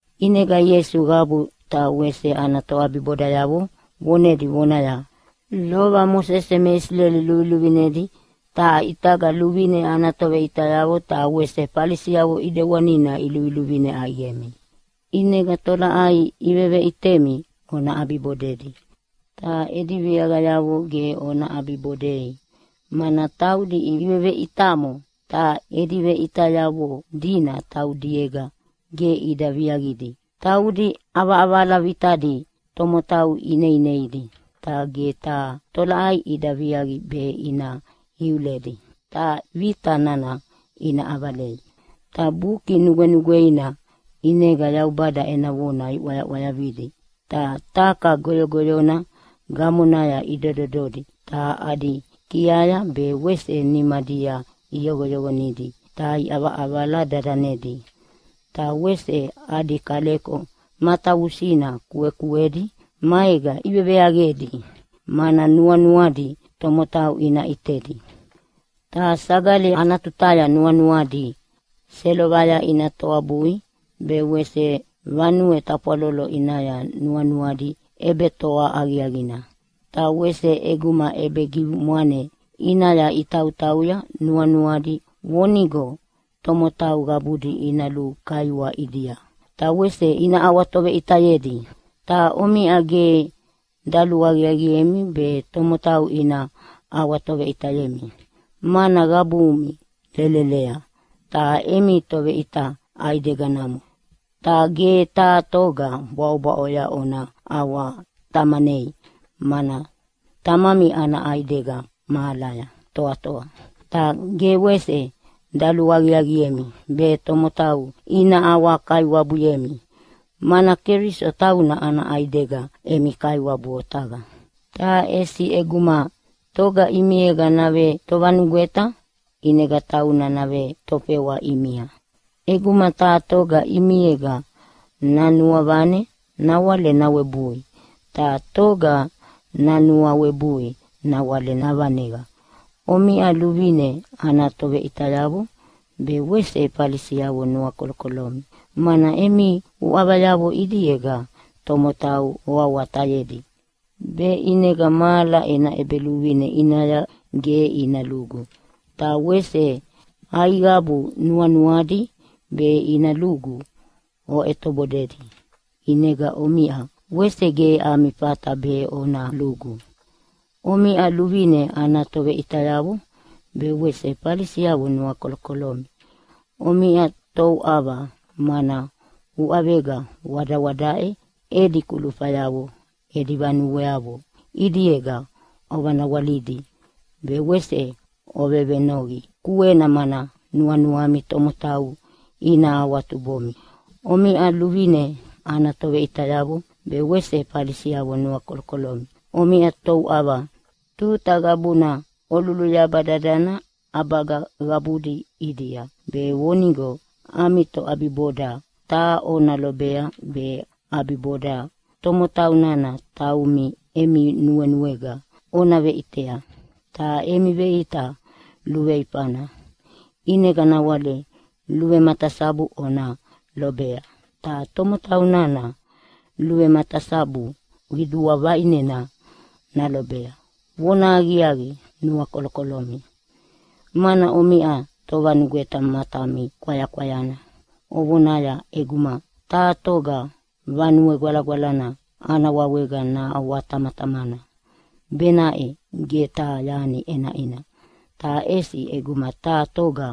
ʼInega Ieisu qabu ta wese ana toʼabibodayavo vonedi vonaya, “Lova Mosese me Isileli luviluvinedi, ta ʼitaga luvine ana toveʼitayavo ta wese Falisiavo ʼidewanina iluviluvine ʼaiqemi. ʼInega tolaʼai iveveʼitemi ona ʼabibodedi, ta edi viaqayavo ge ona ʼabibodei, mana taudi iveveʼitamo, ta edi veʼitayavo dina taudiega ge ida viaqidi. Taudi ʼavaʼavala vitadi tomotau ineineidi, ta ge taha tolaʼai ida viaqi be ina iuledi ta vita nana ina ʼavalei. “Ta Buki Nugwenugweina ʼinega Yaubada ena vona iʼwayaʼwayavidi ta taka goyogoyona gamonaya idodododi ta adi kiaya be wese nimadia iyoqoyoqonidi ta iʼavaʼavala dadanedi. Ta wese adi kaleko matavusina kuekuedi maega iveveaqedi, mana nuanuadi tomotau ina ʼitedi. Ta sagali ana tutaya nuanuadi selovaya ina toabui, be wese vanue tafwalolo ʼinaya nuanuadi ʼebetoa aqiaqina. Ta wese ʼeguma ʼebegimwane ʼinaya itautauya nuanuadi vonigo tomotau qabudi ina lukaiwa ʼidia ta wese ina ʼawatoveʼitayedi. Ta omiʼa ge daluaqiaqiemi be tomotau ina ʼawatoveʼitayemi, mana qabumi lelelea ta emi Toveʼita ʼaidegana namo. Ta ge taha toga bwaʼobwaʼoya ona ʼawatamanei, mana Tamami ana ʼaidega mahalaya toatoa. Ta ge wese daluaqiaqiemi be tomotau ina ʼawakaiwabuyemi, mana Keliso tauna ana ʼaidega emi Kaiwabu otaqa. Ta ʼesi ʼeguma toga ʼimiega navetovanugweta, ʼinega tauna navetofewa ʼimia. ʼEguma taha toga ʼimiega nanuavane nawale nawebui, ta toga nanuawebui nawale navaneqa. “Omiʼa luvine ana toveʼitayavo be wese Falisiavo nuakolokolomi, mana emi uʼavayavo ʼidiega tomotau oawatayedi be ʼinega mahala ena ʼEbeluvine ʼinaya ge ina lugu. Ta wese aiqabu nuanuadi be ina lugu oʼetobodedi. ʼInega omiʼa wese ge ami fata be ona lugu. [Omiʼa luvine ana toveʼitayavo be wese Falisi nuakolokolomi. Omiʼa touʼava! Mana uʼavega wadawadaʼe edi kulufayavo edi vanueavo ʼidiega ovanawalidi, be wese ovevenoqi kuena mana nuanuami tomotau ina awatubomi.] “Omiʼa luvine ana toveʼitayavo be wese Falisiavo nuakolokolomi. Omiʼa touʼava! Tuta qabuna oluluyaba dadana ʼabaga qabudi ʼidia be vonigo ami toʼabiboda taha ona lobea, be ʼabiboda tomotau nana taumi emi nuenuega ona veʼitea. Ta emi veʼita luveifana ʼinega nawale luvematasabu ona lobea, ta tomotau nana luvematasabu qidua vaʼinena nalobea. “Vonahaqiaqi, nuakolokolomi! Mana omiʼa tovanugweta matami kwayakwayana ovonaya, ‘ʼEguma taha toga Vanue Gwalagwalana ana wawega naʼawatamatamana benaʼe ge taha yani ʼenaʼina, ta ʼesi ʼeguma taha toga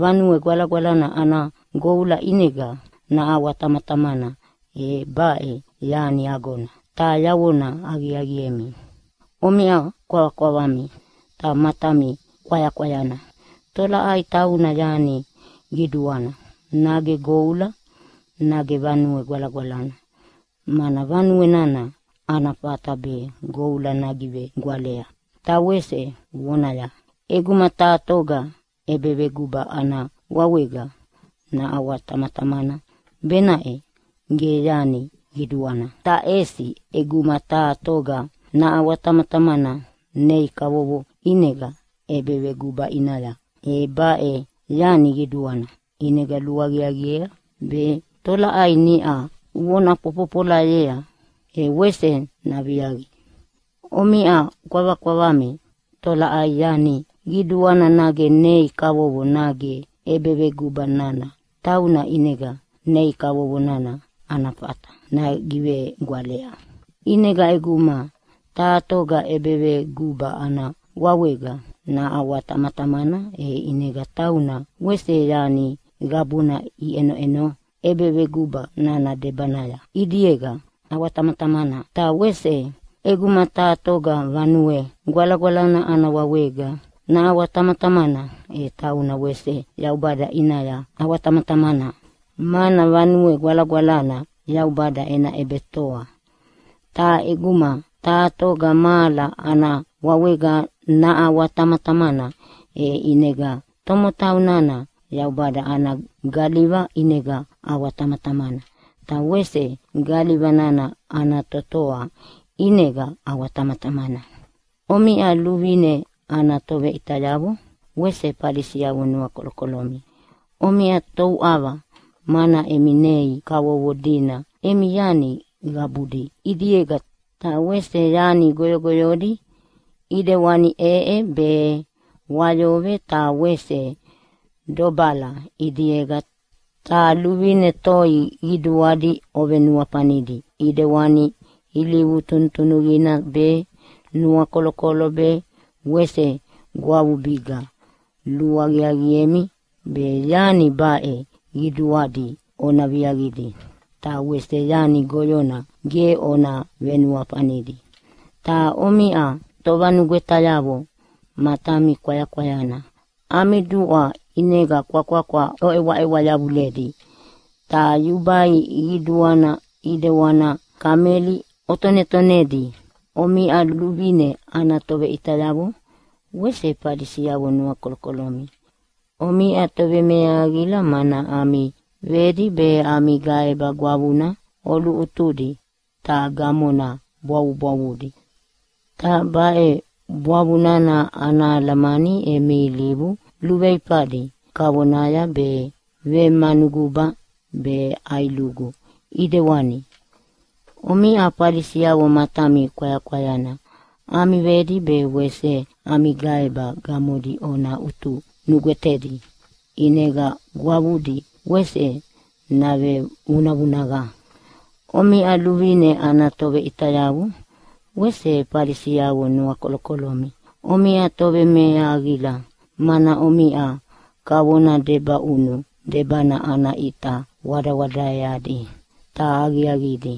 Vanue Gwalagwalana ana goula ʼinega naʼawatamatamana e baʼe yani agona.’ Ta yavona aqiaqiemi, omiʼa kwavakwavami ta matami kwayakwayana. Tolaʼai tauna yani qiduana? Nage goula, nage Vanue Gwalagwalana, mana vanue nana ana fata be goula nagivegwalea? “Ta wese ovonaya, ‘ʼEguma taha toga ʼebeveguba ana wawega naʼawatamatamana benaʼe ge yani qiduana, ta ʼesi ʼeguma taha toga naʼawatamatamana nei kavovo ʼinega ʼebeveguba ʼinaya e baʼe yani qiduana. ʼInega luaqiaqiea be tolaʼai niʼa vona fofofolayea, e wese naviaqi.’ Omiʼa kwavakwavami! Tolaʼai yani qiduana? Nage nei kavovo, nage ʼebeveguba nana tauna ʼinega nei kavovo nana ana fata nagivegwalea? ʼInega ʼeguma taha toga ʼebeveguba ana wawega naʼawatamatamana e ʼinega tauna wese yani qabuna iʼenoʼeno ʼebeveguba nana debanaya ʼidiega ʼawatamatamana. Ta wese ʼeguma taha toga Vanue Gwalagwalana ana wawega naʼawatamatamana e tauna wese Yaubada ʼinaya ʼawatamatamana, mana Vanue Gwalagwalana Yaubada ena ʼebetoa. Ta ʼeguma taha toga mahala ana wawega naʼawatamatamana, e ʼinega tomotau nana Yaubada ana galiva ʼinega ʼawatamatamana, ta wese galiva nana ana Totoa ʼinega ʼawatamatamana. “Omiʼa luvine ana toveʼitayavo wese Falisiavo nuakolokolomi. Omiʼa touʼava, mana emi nei kavovo dina emi yani qabudi ʼidiega, ta wese yani goyogoyodi ʼidewani ʼeʼe be, wayove ta wese dobala ʼidiega. Ta luvine toi qiduadi ovenuafanidi, ʼidewani ilivu tunutunuqina be, nuakolokolo be wese gwavubiga. Luaqiaqiemi be yani baʼe qiduadi ona viaqidi, ta wese yani goyona ge ona venuafanidi. Ta omiʼa tovanugwetayavo matami kwayakwayana. Ami duʼwa ʼinega kwakwakwa oʼewaʼewa yavuledi, ta yubai qiduana ʼidewana kameli otonetonedi. “Omiʼa luvine ana toveʼitayavo wese Falisiavo nuakolokolomi! Omiʼa tovemeahaqila! Mana ami vedi be ami gaeba gwavuna oluʼutudi ta gamona bwavubwavudi. Ta baʼe bwavu nana ana alamani emi ilivu luveifadi kavonaya be vemanuguba be ʼailugu ʼidewani. Omiʼa Falisiavo matami kwayakwayana. Ami vedi be wese ami gaeba gamodi ona ʼutu nugwetedi, ʼinega gwavudi wese navevunavunaqa. “Omiʼa luvine ana toveʼitayavo wese Falisiavo nuakolokolomi! Omiʼa tovemeahaqila, mana omiʼa kavona debaʼunu debana ana ʼita wadawadaeadi ta aqiaqidi,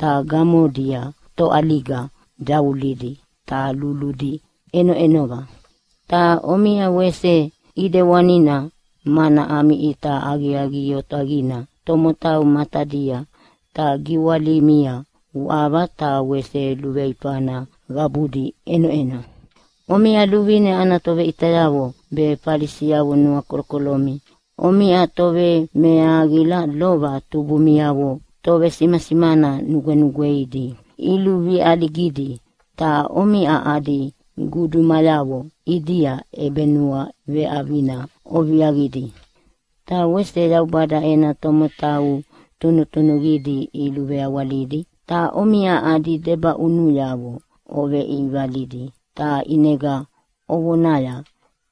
ta gamodia toʼaliga davulidi ta luludi ʼenoʼenova. Ta omiʼa wese ʼidewanina, mana ami ʼita aqiaqi otaqina tomotau matadia, ta giwalimia uʼava ta wese luveifana qabudi ʼenoʼeno. “Omiʼa luvine ana toveʼitayavo be Falisiavo nuakolokolomi. Omiʼa tovemeahaqila! Lova tubumiavo tovesimasimana nugwenugweidi iluveʼaligidi, ta omiʼa adi gudumayavo ʼidia ʼebenuaveʼavina oviaqidi. Ta wese Yaubada ena tomotau tunutunuqidi iluveawalidi, ta omiʼa adi debaʼunuyavo oveʼivalidi, ta ʼinega ovonaya,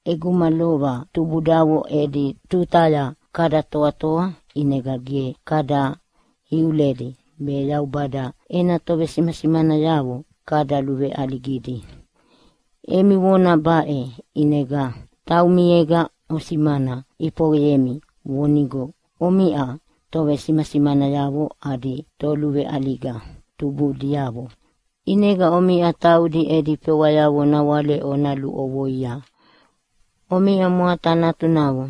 ‘ʼEguma lova tubudavo edi tutaya kada toatoa, ʼinega ge kada iuledi be Yaubada ena tovesimasimanayavo kada luveʼaligidi.’ Emi vona baʼe ʼinega taumiega osimana ʼifoqeyemi vonigo omiʼa tovesimasimanayavo adi toluveʼaliga tubudiavo. ʼInega omiʼa taudi edi fewayavo nawale ona luʼovoia. “Omiʼa mwata natunavo!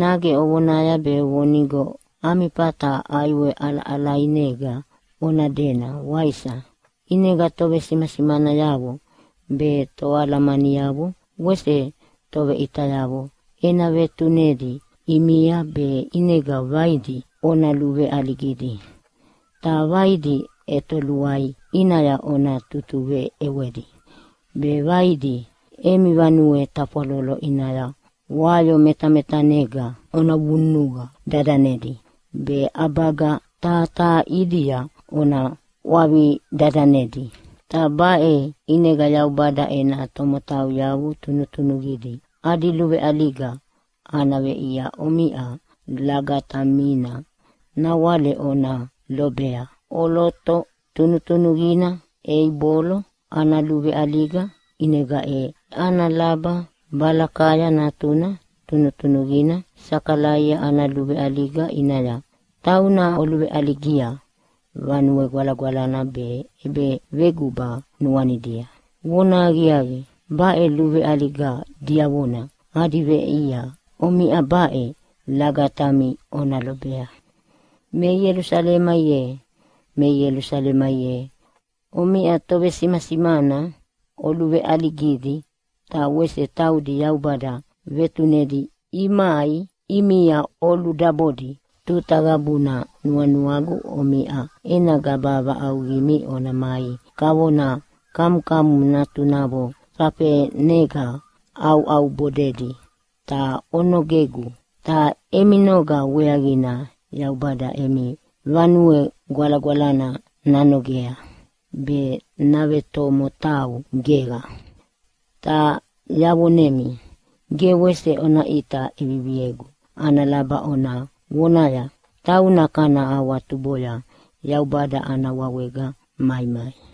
Nage ovonaya be vonigo ami fata ʼaiwe ʼalaʼalainega ona dena, waisa? ʼInega tovesimasimanayavo be toalamaniavo wese toveʼitayavo ena vetunedi ʼimia be ʼinega vaidi ona luveʼaligidi, ta vaidi ʼetoluai ʼinaya ona tutuveʼewedi be vaidi emi vanue tafwalolo ʼinaya wayo metametanega ona vunuqa dadanedi, be ʼabaga taha taha ʼidia ona ʼwavi dadanedi. Ta baʼe ʼinega Yaubada ena tomotau tunutunuqidi adi luveʼaliga ana veʼia omiʼa lagatamina nawale ona lobea ʼoloto tunutunuqina Eibolo ana luveʼaliga ʼinega e ana laba Balakaya natuna tunutunuqina Sakalaia ana luveʼaliga ʼinaya. Tauna oluveʼaligia Vanue Gwalagwalana be ʼebeveguba nuanidia. Vonahaqiaqi, baʼe luveʼaliga diavona adi veʼia omiʼa baʼe lagatami ona lobea. “Me Ielusalema ye, me Ielusalema ye! Omiʼa tovesimasimana oluveʼaligidi, ta wese taudi Yaubada vetunedi imai ʼimia oludabodi. Tuta qabuna nuanuagu omiʼa ena gaba vaʼauqimi ona mai kavona kamukamu natunavo fafenega ʼauʼaubodedi, ta onogegu. Ta emi noga weaqina Yaubada emi Vanue Gwalagwalana nanogea be navetomotau geqa. Ta yavonemi, ge wese ona ʼita ʼeviviegu ana laba ona vonaya, ‘Tauna kana awatuboya Yaubada ana wawega maimai.’”